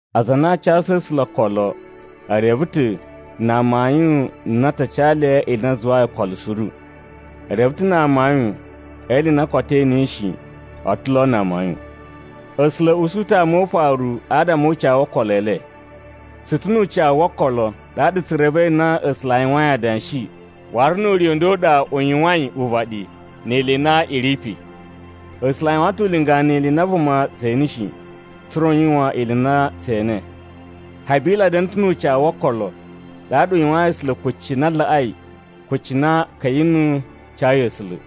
Aza a na a casu A̱sula̱ okolo e reve ta̱ na amayun a na a ta ca le ili i na a zuwai okolo suru. E reve ta̱ na amayun e ili i na koto e enei shi a̱ ta̱ lo na amayun. A̱sula̱ a̱ usu ta̱ ama o ufaru adama o ucawu wo okolo e le. Tsu ta̱ nu ucawu wo okolo, ɗaɗa tsu revei na A̱sula̱ a yuwain adanshi, waru nu ure u nda u ɗa u yuwain uvaɗi ni ili i na i ri pe. A̱sula̱ a yuwan ta̱ ulinga ni ili i na vuma tse ene shi, tsa̱ra̱ u yuwan ili i na tsee ene. Habila da̱na̱ ta̱ nu ucawu wo okolo, ɗaɗa u yuwayin A̱sula̱ kucci na laꞌai kucci na Ka̱yinu cayi A̱sula̱.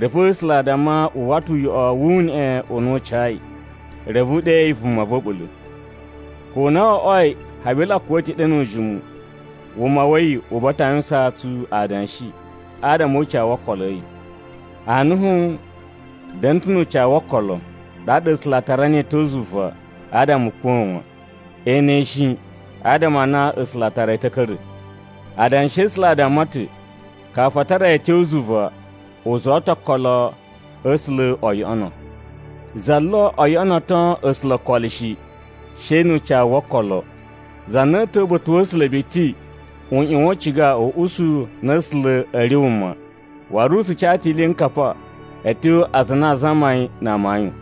Reve A̱sula̱ a damma wu uwwa ta̱ uyoꞌo wu uneꞌe u na u cayi, reve u ɗeyi vuma va̱ a̱ɓula̱. Ko na wo oꞌwoi Habila kuwa̱ ta̱ ɗe nu ujimu, wuma wa̱ yi u buwa ta̱ a yuwusaan tsu adanshi adama o ucawu wo okolo a̱ yi. Anuhu da̱na̱ ta̱ nu ucawu wo okolo, ɗaɗa A̱sula̱ a tara niyi a̱ tyo zuva adama u kuwa̱ wan. E ene yi shi, adama a na A̱sula̱ a tara yi ta̱ a̱ ka̱ra̱. Adanshi a̱ A̱sula̱ a damma ta̱ kafu a tara yi a̱ tyo zuva, u zuwa ta̱ okolo a̱ A̱sula̱ o yoꞌono. Za lo o yoꞌonoto A̱sula̱ okolo shi, she nu ucawu wo okolo. Za na a̱a̱ ta̱wa̱ uba̱ta̱ wa̱ A̱sula̱ biti u ꞌyuwan u ciga u usu na A̱sula̱ a̱ ri wuma, waru u tsu ca ta̱ iliyinkapa a̱ tyo aza a na a zama yi na amayun.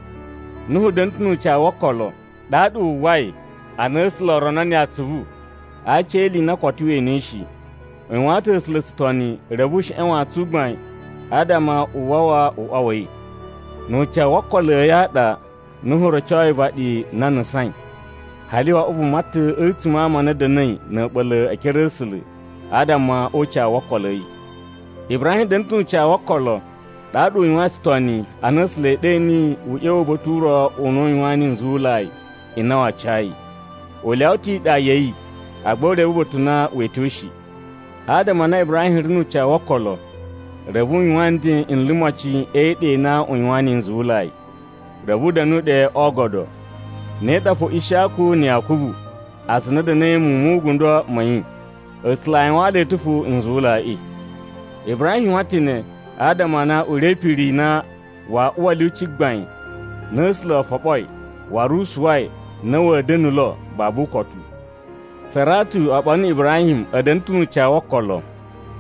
Nuhu da̱na̱ ta̱ nu ucawu wo okolo, ɗaɗa wu uwwai ana A̱sula̱ o rono niyi atsuvu a aci e ili i na koto we enei shi. U yuwaan ta̱ A̱sula̱ tsutoni reve u sheꞌen wantsun u gbain adama u wawa uꞌwa wa̱ yi. Nu ucawu wo okolo a̱yi a ɗa, Nuhu rocoi uvaɗi na a nusain. Hali wo oꞌwo vuma ta̱ a̱tsuma̱ a ama a na a̱ da̱na̱i na̱ a̱ɓula̱ e ekere a̱ A̱sula̱ adama o ucawu wo okolo a̱ yi. Ibrahim da̱na̱ ta̱ nu ucawu wo okolo, ɗaɗa u yuwain tsutoni ana A̱sula̱ e ɗe niyi u ꞌya̱wa̱ uba̱ta̱ u ro u na u yuwaan niyi nzuwulai n na waa ca yi. U lyawa ta̱ iɗa ya̱ yi, agba u reve uba̱ta̱ u na wee tyo shi. Adama a na Ibrahim ri nu ucawu wo okolo, reve u yuwan nden n limocin e iɗa i na a yuwaan niyi nzuwulai. Reve u da̱nu ɗe o oogodo, ne ɗa fo Ishiyaku na̱ Yakubu aza a na a̱ da̱na̱i muwun mu ugundo ma̱ yi. A̱sula̱ a yuwaan le ta̱ fo nzuwulaiꞌi. Ibrahim yuwan ta̱ ne adama a na u ri e ipiri i na waa uwa a̱ lyuci gbain na A̱sula̱ o foɓoi waru u suwai na wa̱a̱ da̱na̱ lo babu ukotu. Saratu oɓolo na̱ Ibrahim a̱ da̱na̱ ta̱ nu ucawu wo okolo,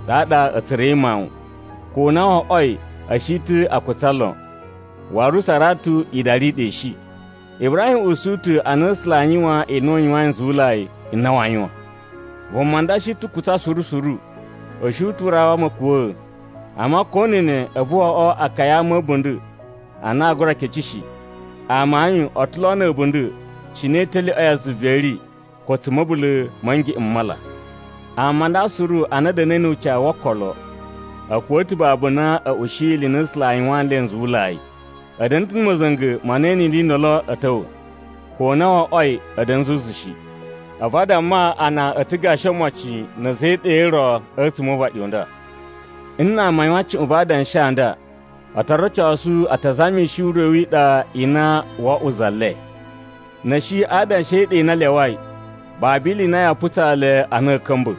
ɗaɗa a̱ tsura̱i mawun, ko na wo oꞌwoi a̱ shi ta̱ a kutsa lon, waru Saratu idari i ɗa i shi. Ibrahim usu ta̱ a na A̱sula̱ aa yuwan ili i na u yuwain nzuwulai n na waa yuwan. Vuma nda shi ta̱ kutsa suru suru, u shi ta̱ u rawa ma̱kuwa̱a̱, amma ko na̱ ne a̱vu wo oꞌwo akaya a ama a̱ a̱bunda̱ a na a gura kece shi. Amayun, a̱ ta̱ lo na̱ a̱bunda̱ cine italyoꞌo ya zuva i ri ko tsa̱ ma̱bula̱ ma̱ ngeꞌen m mala. Ama a nda suru a na a̱ da̱na̱i nu ucawu wo okolo, a̱ kuwa̱ ta̱ babu na a̱ ushiyi ili i na A̱sula̱ a yuwaan nle nzuwulai. A̱ da̱na̱ ta̱ na̱ ma̱za̱nga̱ ma na ee ene ili i ndolo a̱ ta̱wa̱, ko na wo oꞌwoi a̱ da̱na̱ zuzu shi. A̱vu a damma a na a̱ ta̱ gashi omocin na̱ a̱za̱ e iɗa i ro a̱tsuma̱ o uvaɗi u nda. Nna ama a yuwan cuꞌun va adanshi a nda, o to rocosu a ta zamishi ure wi iɗa i na wo oꞌwo za le. Na̱ a̱ shi a adanshi e iɗa i na a lyawai, babu ili i na yaa putsa le a na a̱a̱ ka̱mba̱.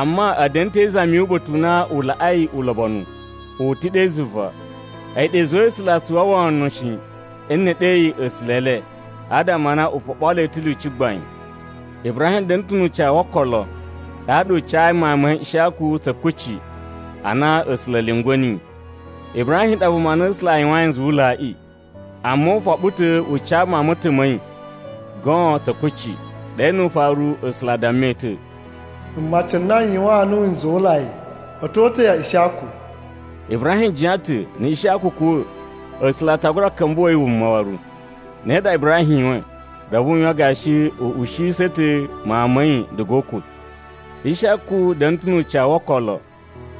Amma a̱ da̱na̱ te izami yu uba̱ta̱ u na u laꞌai ulobonu. U ta̱ ɗe zuva. A̱yi ɗa i zuwai A̱sula̱ a tsu uwwa wono shi nne e ɗe yi A̱sula̱ e le, adama a na u foɓoo le ta̱ lyuci gbain. Ibrahim da̱na̱ ta̱ nu ucawu wo okolo, ɗaɗa u cayi mawun ma̱ yi Ishiyaku tsa̱ kucci ana A̱sula̱ a̱ lyungwa̱ niyi. Ibrahim ɗa vuma na A̱sula̱ a yuwayin nzuwulaiꞌi, amma u foɓo ta̱ u ca mawun ma̱ ta̱ ma̱ yi goon tsa̱ kucci. Ɗe nu ufaru, A̱sula̱ a damma yi ta̱, “Mmaci n na n yuwaan nuwu nzuwulai a̱ ta̱ o uta̱ ya Ishiyaku.” Ibrahim jiyan ta̱ na̱ Ishiyaku kuwa̱, A̱sula̱ a ta gura ka̱mba̱to yi wuma waru. Ne ɗa Ibrahim yuwain, reve u yuwan gashi u ushiyisa̱ ta̱ mawun ma̱ yi diga o ukwa̱. Ishiyaku da̱na̱ ta̱ nu ucawu wo okolo,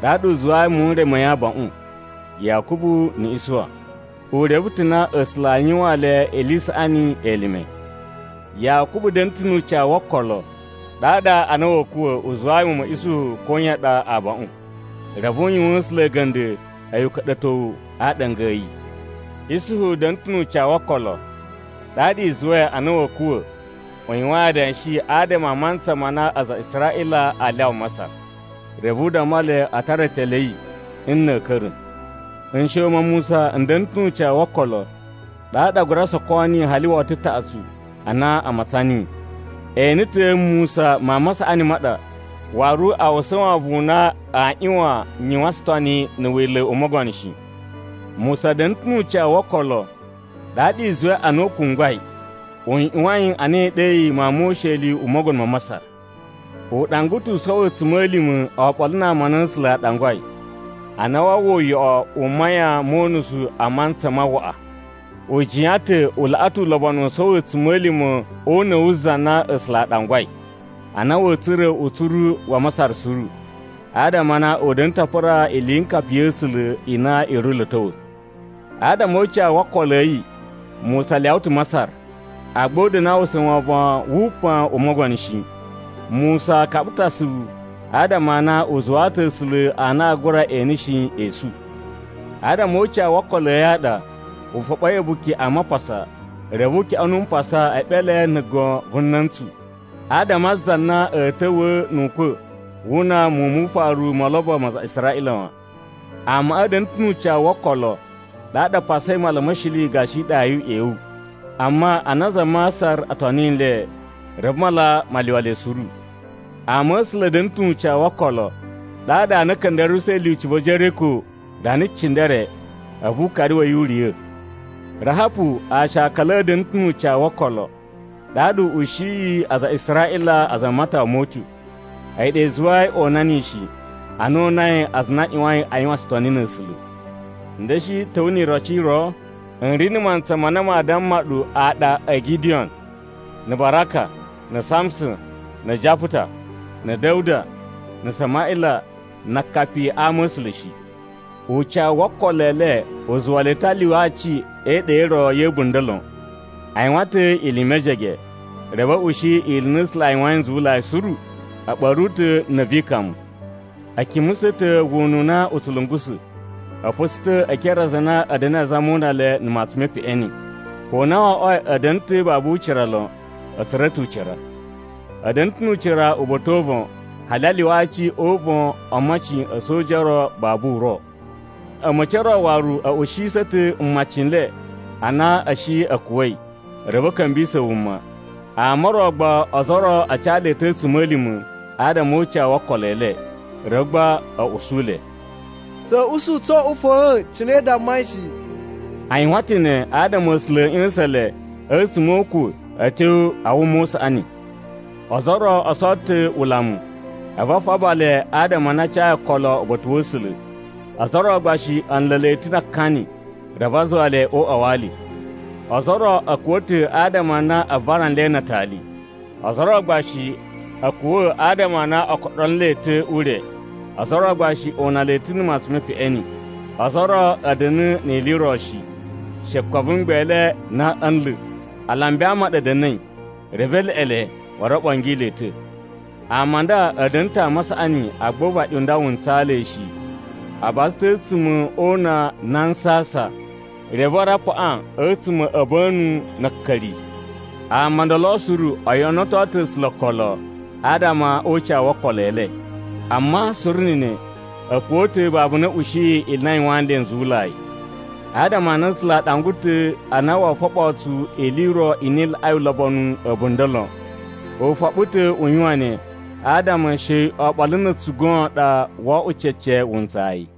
ɗaɗa u zuwayi muwun n re ma̱ yi abaꞌun, Yakubu na̱ Isuwa. U reve ta̱ na A̱sula̱ aa yuwaan le ili i saꞌani elime. Yakubu da̱na̱ ta̱ nu ucawu wo okolo, ɗaɗa ana wa̱a̱ kuwa̱, u zuwayi muwun ma̱ Isuhu koyan ɗa abaꞌun. Reve u yuwaan A̱sula̱ a̱ga̱nda̱ a̱yi uka̱ɗa̱towu a aaɗanga a̱ yi. Isuhu da̱na̱ ta̱ nu ucawu wo okolo, ɗaɗa i zuwai ana wa̱a̱ kuwa̱, u yuwain adanshi adama a mantsa ma na aza a Israꞌila aa lyawa Masar. Reve u damma le a tara etele a̱ yi nna̱ a̱a̱ ka̱ra̱. Nsha̱wu ma Musa n da̱na̱ ta̱ nu ucawu wo okolo, ɗaɗa a gura soko niyi hali woto taꞌatsu ana a matsan niyi. E ene ta̱ Musa mawun ma saꞌani ma ɗa, waru a uwwusa wovon u na aa ꞌyuwan yuwan tsutoni na̱ wila̱ u mogono shi. Musa da̱na̱ ta̱ nu ucawu wo okolo, ɗaɗa i zuwai ana u kungwai, u ꞌyuwain a na e ɗe yi mawun mo usheli u mogono ma Masar. U ɗangwa ta̱ u sowo a̱tsuma̱lima̱ oɓolo na ama a na A̱sula̱ a ɗangwai, a na waa uwwa uyoꞌo u mayan mo unusu a mantsa ma waꞌa. U jiyan ta̱ u laꞌa ta̱ ulobonu u sowo a̱tsuma̱lima̱ o una̱ wu Za na A̱sula̱ a Ɗangwai, a na wa̱a̱ tsura̱ utsuru wa Masar suru, adama a na u da̱na̱ ta̱ a pura iliyinkapa ya̱ A̱sula̱ i na i ri lo a̱ ta̱wa̱. Adama o ucawu wo okolo a̱ yi, Musa lyawa ta̱ Masar, agba u da̱na̱ a uwwusa wovon wu upan u mogono shi. Musa kaɓa ta̱ asuvu adama a na u zuwaa ta̱ A̱sula̱ a na aa gura ene shi esu. Adama o ucawu wo okolo a̱ yi a ɗa, u foɓoi A̱buki a Mapasa reve u kyoꞌonu mpasa e eɓele na̱ gon vu na̱ntsu, adama a za na a̱a̱ ta̱wa̱a̱ nu ukwa̱ wu una muwun mu ufaru mo olobo ma aza a Israꞌila wan. Amaꞌa a̱ da̱na̱ ta̱ nu ucawu wo okolo, ɗaɗa a pasai Mala ma̱ Shili gashi iɗa yu uꞌyewu. Amma ana aza a Masar o toni nle, reve mala ma lyuwa le suru. Ama a̱ A̱sula̱ a̱ da̱na̱ ta̱ nu ucawu wo okolo, ɗaɗa ana a̱ ka̱nda̱ruwusa̱i lyuci va̱ Jeriko rana cindere, a̱vu ukari wa̱ yi u riya̱. Rahapu aashakala a̱ da̱na̱ ta̱ nu ucawu wo okolo, ɗaɗa u ushiyi aza a Israꞌila aza a matawa mo utyo. A̱yi ɗa i zuwai o una niyi shi, ana o unai aza a na a ꞌyuwain a yuwan tsutoni na̱ A̱sula̱. N da̱shi ta̱wa̱ ni iroci i ro? N ri na̱ mantsa ma na maa damma ɗu aɗa o Gidiyon, na̱ Baraka, na̱ Samuson, na̱ Japuta, na̱ Da̱wuda, na̱ Samaꞌila, na akapi a ama̱sula̱ shi. Ucawu wo okolo e le u zuwa le ta̱ a lyuwa aci e iɗa i ro ya̱ a̱bunda̱ lon. A yuwan ta̱ ili i mejege, reve a̱ ushi ili i na A̱sula̱ a yuwain nzuwulai suru. A̱ ɓa̱ru ta̱ na̱ vi ikamu. A̱ kimusa̱ ta̱ wuna u na u tsu lungusa̱. A̱ fa̱tsa̱ ta̱ e ekere a aza a na a̱ da̱na̱i azama o una le na̱ mutsun mu peꞌeni. Ko na wo oꞌwoi a̱ da̱na̱ ta̱ babu ucira lon, a̱ tsura̱ ta̱ ucira. A̱ da̱na̱ ta̱ nu ucira uba̱ta̱ o uvon hali a lyuwa aci o uvon o omocin a̱ a̱soja o ro babu uro. A̱ma̱ci o ro waru a̱ ushiyisa̱ ta̱ mmaci n le a na a̱ shi a̱ kuwa̱i reve a̱ ka̱mbisa̱ wuma. Ama o ro gba ozo o ro a ca le ta̱ a̱tsuma̱lima̱ adama o ucawu wo okolo e le, reve gba a̱ usu le, “Tsa̱a̱ usu tso oꞌwo fa̱a̱n cine i dammai shi!” A yuwan ta̱ ne adama A̱sula̱ a̱ ꞌya̱sa̱n le a̱tsuma̱ o ukwa̱ a̱ tyo a wuma u saꞌani. Ozo o ro o sowo ta̱ ulamu, a̱vu a faba le adama a na a cayi okolo uba̱ta̱ wa̱ A̱sula̱, ozo o ro gba shi a̱ nla̱ le ta̱ na akani reve a zuwa le o uꞌwa wa ali. Ozo o ro a̱ kuwa̱ ta̱ adama a na a vara nle na atali. Ozo o ro gba shi a̱ kuwa̱ adama a na o koɗulo nle ta̱ ure. Ozo o ro gba shi o una le ta̱ na̱ matsun me peꞌeni. Ozo o ro a̱ da̱na̱ ni ili i ro shi, she kwan vu mgbele n na a̱a̱ nla̱. Alambi a ama a ɗa a̱ da̱na̱i, reve e leꞌe le, waru o ɓongi le ta̱. Ama a nda a̱ da̱na̱ ta̱ ama a saꞌani agba uvaɗi u nda wu ntsaa le shi. A baza ta̱ a̱tsuma̱ o una na a nsasan, reve waru a paꞌan a̱tsuma̱ a̱ a̱ba̱nu na̱ a̱ a̱ka̱ri. Ama o ndolo suru o yoꞌonoto ta̱ A̱sula̱ okolo adama o ucawu wo okolo e le! Amma suru na̱ ne, a̱ kuwa̱ ta̱ babu na a̱ ushiyi ili i na a yuwaan nle nzuwulai. Adama a na A̱sula̱ a ɗangwa ta̱ a na woo foɓoo tsu ili i ro i na i laꞌai ulobonu a̱bunda̱ lon. U foɓo ta̱ u yuwan ne adama she oɓolo na̱ a̱tsu goon ɗa oo oꞌwo cece wuntsayi.